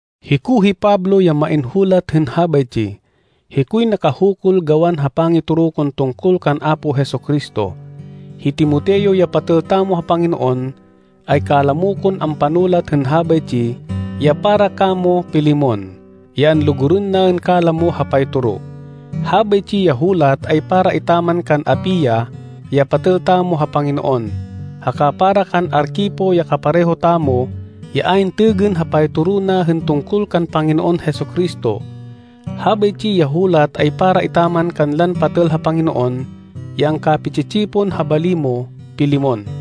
Hiko hi Pablo ya main hulat hên habaytsi. Hikoy nakahukul gawan ha pangitoro kon tungkol kan Apo Jesu-Cristo. Hi Timoteo ya patêl tamo ha Panginoon ay kalamo kon ampanulat hên habaytsi ya para kamo, Filemon, ya anlugurên naên kalamo ha paytoro. Habaytsi ya hulat ay para etaman kan Apia ya patêl tamo ha Panginoon, haka para kan Arquipo ya kapareho tamo ya ayn têgên ha paytoro na hên tungkol kan Panginoon Jesu-Cristo. Habaytsi ya hulat ay para etaman kanlan patêl ha Panginoon ya angkapi-tsi-tsipon ha bali mo, Filemon.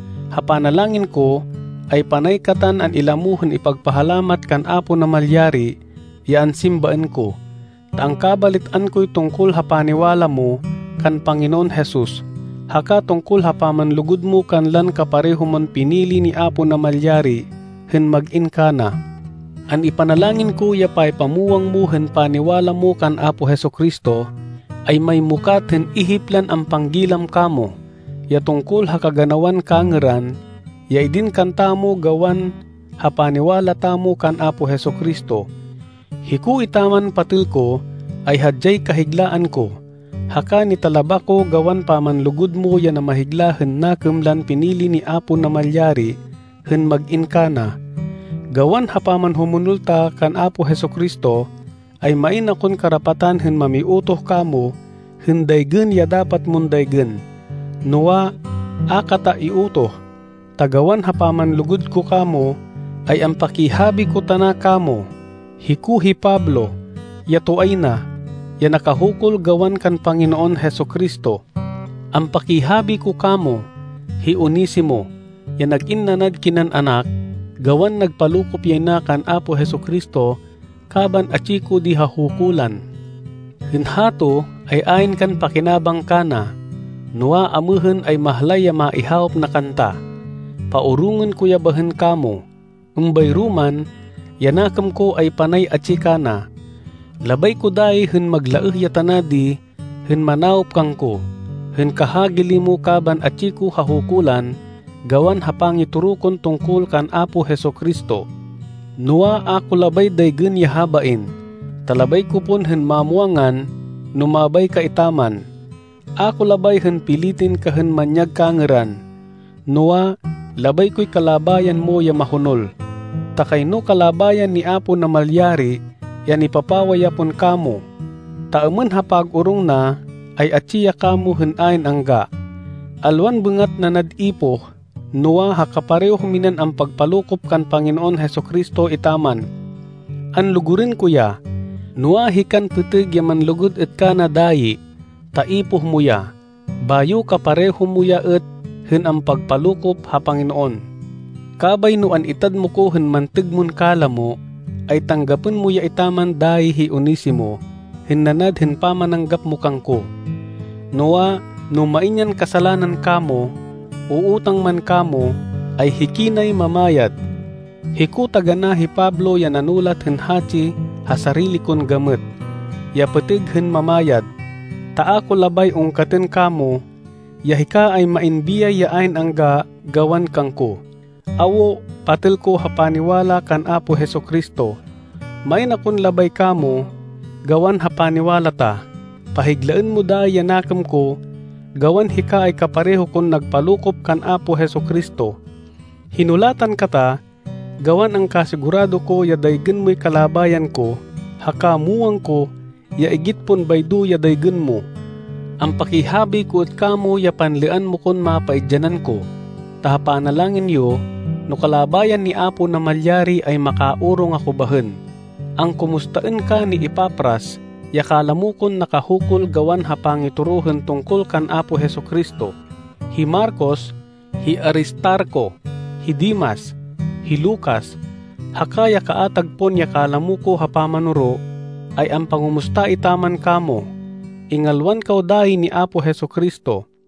Ha panalangin ko, ay panay katan an-ilamo hên ipagpahalamat kan Apo Namalyari, ya ansimbaên ko, ta angkabalit-an koy tungkol ha paniwala mo kan Panginoon Jesus haka tungkol ha pamanlugud mo kanlan kapareho mon pinili ni Apo Namalyari hên mag-in kana. An-ipanalangin ko ya paypamwang mo hên paniwala mo kan Apo Jesu-Cristo ay maymukat hên ihip lan ampanggilam kamo ya tungkol ha kaganawan kangêran ya idin kantamo gawan ha paniwala tamo kan Apo Jesu-Cristo. Hiko etaman, patêl ko, ay hadyay kahiglaan ko, haka nitalaba ko gawan pamanlugud mo ya namahigla hên nakêm lan pinili ni Apo Namalyari hên mag-in kana. Gawan ha pamanhumonol ta kan Apo Jesu-Cristo ay main akon karapatan hên mamiutoh kamo hên daygên ya dapat mon daygên. Noa, a kata iutoh, ta gawan ha pamanlugud ko kamo, ay ampakihabi ko tana kamo. Hiko hi Pablo, ya toay na, ya nakahukul gawan kan Panginoon Jesu-Cristo. Ampakihabi ko kamo, hi Onesimo, ya nag-in nanad kinan anak, gawan nagpalokop yay na kan Apo Jesu-Cristo kaban atsi ko di ha hukulan. Hên hato ay ayn kan pakinabang kana. Noa, amêhên ay mahlay ya maihawop na kanta. Paorongên ko ya bahên kamo. Êmbayro man, ya nakêm ko ay panay atsi kana. Labay ko dayi hên maglaêh ya tana di hên manawop kangko, hên kahagili mo kaban atsi ko ha hukulan gawan ha pangitoro kon tungkol kan Apo Jesu-Cristo. Noa, a ko labay daygên ya habain, ta labay ko pon hên mamwangan, no mabay ka etaman. A ko labay hên pilitên ka hên manyag kangêran, noa, labay koy kalabayan mo ya mahonol. Ta kayno kalabayan ni Apo Namalyari ya nipapawa ya pon kamo, ta êmên ha pag-orong na ay atsi ya kamo hên ayn angga, alwan bêngat nanad ipoh, noa, ha kapareho minan ampagpalokop kan Panginoon Jesu-Cristo etaman. Anlugurên ko ya, noa, hikan pêtêg ya manlugud êt kana dayi, ta ipoh mo ya, bayo kapareho mo ya êt hên ampagpalokop ha Panginoon. Kabay no an-itad mo ko hên mantêg mon kalamo, ay tanggapên mo ya etaman dayi hi Onesimo hên nanad hên pamananggap mo kangko. Noa, no main yan kasalanan kamo, o utang man kamo, ay hikinay mamayad. Hiko taganá hi Pablo ya nanulat hên hatsi ha sarili kon gamêt, ya pêtêg hên mamayad, ta a ko labay ungkatên kamo ya hika ay main biyay ya ayn angga gawan kangko. Awo, patêl ko ha paniwala kan Apo Jesu-Cristo, main akon labay kamo gawan ha paniwala ta. Pahiglaên mo dayi ya nakêm ko gawan hika ay kapareho kon nagpalokop kan Apo Jesu-Cristo. Hinulatan kata gawan angkasigurado ko ya daygên moy kalabayan ko. Haka muwang ko ya igit pon baydo ya daygên mo. Ampakihabi ko êt kamo ya panlêan mo kon mapaidyanan ko, ta ha panalangin yo, no kalabayan ni Apo Namalyari, ay makaorong ako bahên. Angkumustaên ka ni Epafras, ya kalamo kon nakahukul gawan ha pangitoro hên tungkol kan Apo Jesu-Cristo. Hi Marcos, hi Aristarco, hi Demas, hi Lucas, haka ya kaatag pon ya kalamo ko ha pamanoro, ay ampangumusta etaman kamo. Ingalwan kaw dayi ni Apo Jesu-Cristo.